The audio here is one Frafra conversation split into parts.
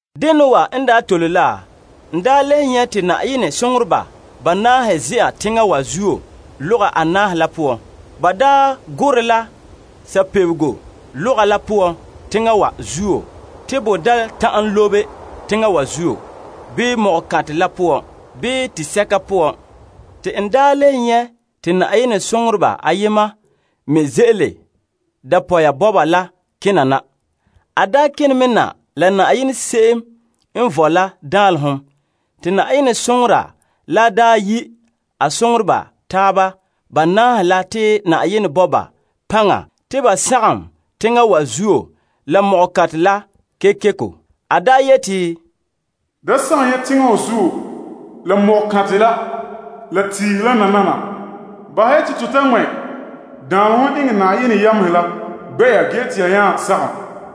Dena wa n daa tole la, n le nyɛ' te Yenɛ soŋoreba banaahe ze'a teŋa wa zuo lɔga anaahe la poan. Ba gorɛ la sabebego lɔga la poan teŋa wa zuo te bo da ta'an lobe teŋa wa zuo, bii ko'kantɛ la poan, bii tisɛka poan. Te n le nyɛ' te Yenɛ soŋora ayema me ze'ele dapɔya bɔba kene mɛ na la Yenɛ Se'em n Vɔe la danlehom. Te Yenɛ soŋora la yi' a soŋoreba taaba banaahe la te Yenɛ bo ba paŋa te ba sagom teŋa wa zuo la ko'kantɛ la kekeko. A yeti, Da sagom ya teŋa wa zuo la ko'kantɛ la, la tiihe la nana. Bahɛ ya te to ta daanlɛ enŋa Yenɛ yamehe la gbɛ'ɛra ge te ya nya sagom.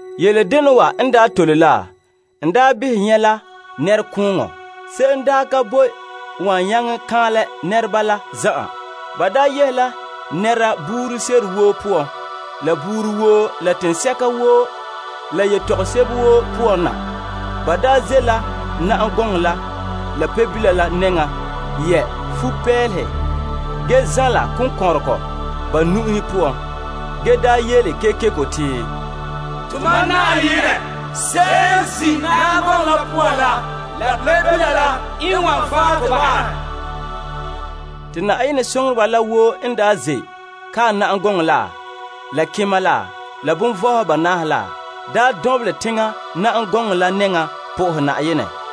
Yele dena wa n tole la, n behɛ nyɛ' la nɛrekooŋɔ. Se'em ka boe n wan nyaŋɛ kaanlɛ nɛreba la zan'an. Ba yehe la nɛreba woo poan, la buuri woo, la teŋhe woo, la yetɔgom woo poan na. Ba ze' la na'am gɔŋɔ la, la Pebila la nɛŋan yɛ' futo n ane fa'a ge zanla konkɔnrɔgɔ ba nu'uhen poan, ge yele kekeko yeti, Tomam Yenɛ, se'em n zin' na'am gɔŋɔ la poan la la Pebila la n wan fan' to bahɛ. Te Yenɛ soŋoreba la woo n ze' kae na'am gɔŋɔ la, la kema la, la kelompagehedoma banaahe la, lu na'am gɔŋɔ la nɛŋan na'ahe Na'ayenɛ.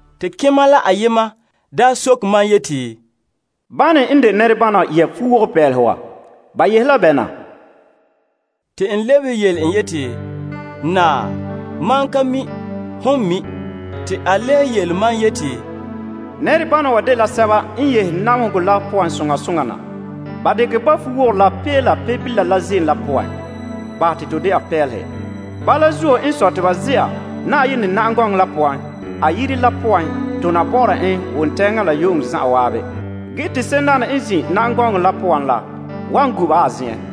Te kema la ayema soke mam yeti, Bane n de nɛrebana wa yɛ' futo n ane fa'a wa? Ba yehe la bɛ na? Te n lebehe yele en yeti, Naa, mam ka mi'. Hon mi'. Te a le yele mam yeti, Nɛrebana wa dela sɛba n yehe namehegɔ la poan soŋa soŋa na. Ba dekɛ ba fuwogorɔ la pee la Pebila ziim la poan bahɛ te to ana fa'a. Bala zuo te ba ze'a Yenɛ na'am gɔŋɔ la nɛŋan, tona bɔ'ɔra en wontɛɛŋa la yu'uŋɔ zan'an Yenɛ Yire la poan. Ge te se'emdaana n zin' na'am gɔŋɔ la poan la wan gu'ura ba.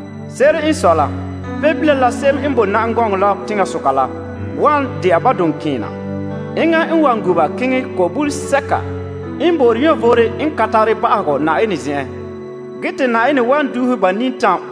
Se'ere n sɔe la, Pebila la, se'em n bo na'am gɔŋɔ la teŋasoka la wan dɛna ba duŋkeena. Enŋa n wan gu'ura ba keŋɛ bulega sɛka ko'om n bo'ore vom n ka tare ba'ahegɔ Yenɛ zen'en. Ge te Yenɛ wan duuhe ba nintam.